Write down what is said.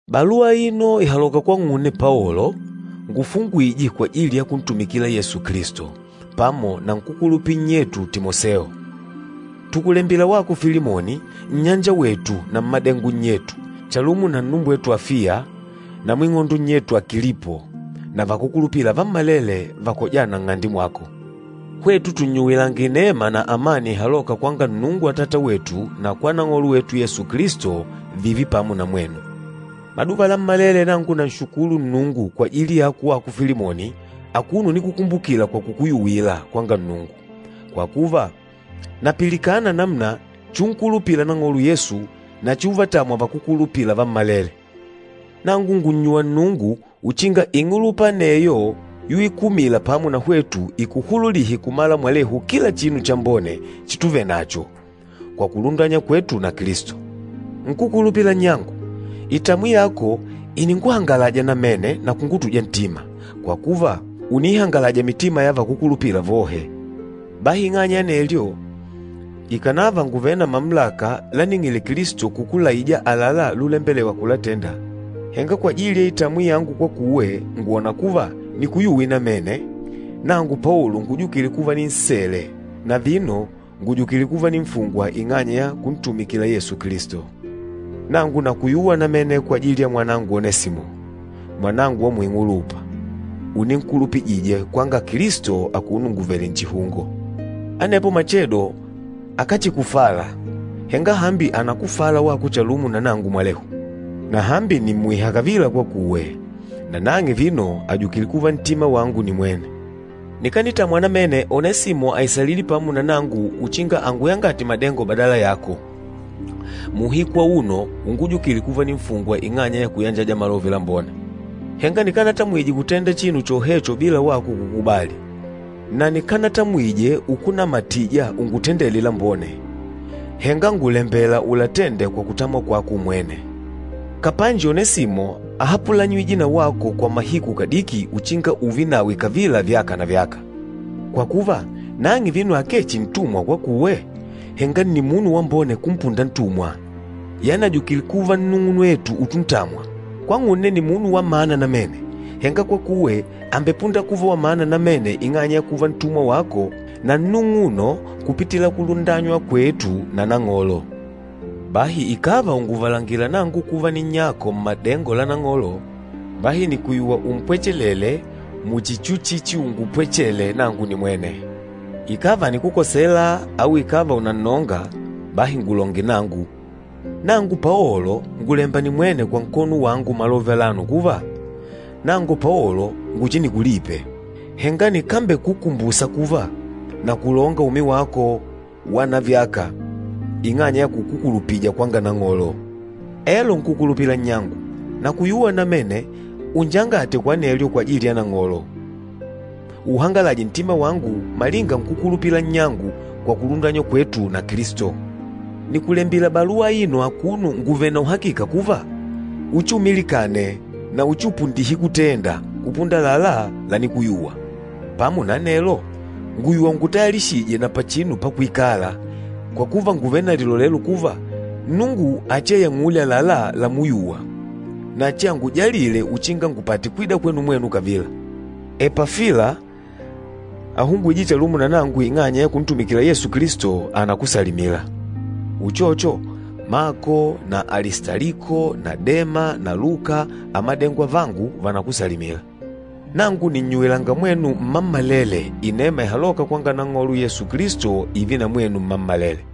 Baluwa aino ìhaloka kwang'une Paolo, ngufungwîje kwajili ya kuntumikila Yesu Kilisto, pamo na nkúkulupila nnyetu Timoseo. Tùkulembila wako Filimoni, nnyanjawetu na mmádengo nnyetu, chalumo na nnumbwetu Afiya na mwing'ondo nnyetu Akilipo na vakúkulupila vammalele vakojâna nng'ande mwako. Hwetu tùnnyuwilanga inema na amani ihalôka kwanga Nnungu Atata wetu na kwa Nang'olo wetu Yesu Kilisto, vììve pamo na mwenu. Maduva lammalele nangu nanshukulu Nnungu kwajili yako wako Filimoni akuno unikukumbukila kwa kukuyuwila kwanga Nnungu, kwa kuva, napilikana namuna chiunkulupila Nang'olo Yesu na chiuvatamwa vakúkulupila vammalele. Nangu ngùnnyuwa Nnungu uchinga ing'ulupa aneyo yuikumila pamo na hwetu ikuhululihe kumala mwalehu kila chinu chambone chituvenacho, kwa kulundanywa kwetu na Kilisto. Nkúkulupila nnyangu, itamwi yako ìninguhangalaja namene na kungutuja ntima, kwa kuva ùniihangalaja mitima ya vakúkulupila vohe. Bahi ing'anya ya anelyo, ikànava ngùvele na mamulaka láning'ìlè Kilisto kukulaija àlalá lulembelewa kulatenda, henga kwajili ya itamwi yangu kwakuwe, ngwòna kuva nikuyuwe namene, nangu Paolo ngujukîle kuva ninsele, na vino ngùjukile kuva ninfungwa ing'anya ya kuntumikila Yesu Kilisto. Nangu nakuyuwa namene kwajili ya mwanangu Onesimo, mwanangu wa muing'ulupa, uninkulupijije kwanga Kilisto akuno nguvèlè nchihungo. Anepo machedo akáchikufala, henga hambi ànakufala wako chalumo na nangu mwalehu. Na hambi nìmmuiha kavila kwakuwe, na nang'e vino àjukile kuva ntima wangu nimwene. Nikanitamwa namene Onesimo aisalile pamo na nangu uchinga anguyangate madengo badala yako, muuhiku auno ungujukile kuva ninfungwa ing'anya ya kuyanjaja Malove Lambone. Henga nikanatamwije kutenda chinu chohecho bila wako kukubali. Na nikanatamwije ukunamatija ungutendele lambone, henga ngùlembela ulatende kwa kutamwa kwako umwene. Kapanji Onesimo áhapulanyijwe na wako kwa mahiku kadiki uchinga ùùve nawe kavila vyaka na vyaka. Kwa kuva, nang'e vino akee chihi ntumwa kwakuwe, henga nni munu wambone kumpunda ntumwa, yani àjukile kuva nnung'unwetu utuntamwa. Kwang'une nni munu wa mana namene, henga kwakuwe àmbepunda kuva wa mana namene ing'anya ya kuva ntumwa wako na nnung'uno kupitila kulundanywa kwetu na Nang'olo. Bahi ikàva ùnguvalangila nangu kuva ninnyako mmàdengo la Nang'olo, bahi nìkuyuwa umpwechelele muchi chuchichiungupwechele nangu nimwene. Ikàva ànikukosela au ikàva ùnannonga, bahi ngulonge nangu. Nangu Paolo ngùlemba nimwene kwa nkono wangu malove alano kuva, Nangu Paolo nguchinikulipe, henga nikambekukumbusa kuva, nakulonga umi wako wa navyaka, ing'anya ya kukukulupija kwanga Nang'olo! Elo nkúkulupila nnyangu, nakuyuwa namene unjangate kwa anelyo kwajili ya Nang'olo, uuhangalaje ntima wangu malinga nkúkulupila nnyangu kwa kulundanywa kwetu na Kilisto. Nìkulembila baluwa aino akuno nguvèlè na uhakika kuva, uchiumilikane na uchiupundihe kutenda, kupunda àlalá lanikuyuwa. Pamo na anelo, ngùyuwa ungutayalishije na pachinu pakuikala, kwa kuva ngùvele na lilolelo kuva, Nnungu achiayang'ule àlalá lamuyuwa, na achiangujalile uchinga ngupate kwida kwenu mwenu kavila. Epafila, ahungwîje chalumo na nangu ing'anya ya kuntumikila Yesu Kilisto, ànakusalimila. Uchocho, Mako na Alistaliko na Dema na Luka, amadengo avangu, vànakusalimila. Nangu nìnnyuwilanga mwenu mmammalele inema ihalôka kwanga Nang'olo Yesu Kilisto ììve na mwenu mmammalele.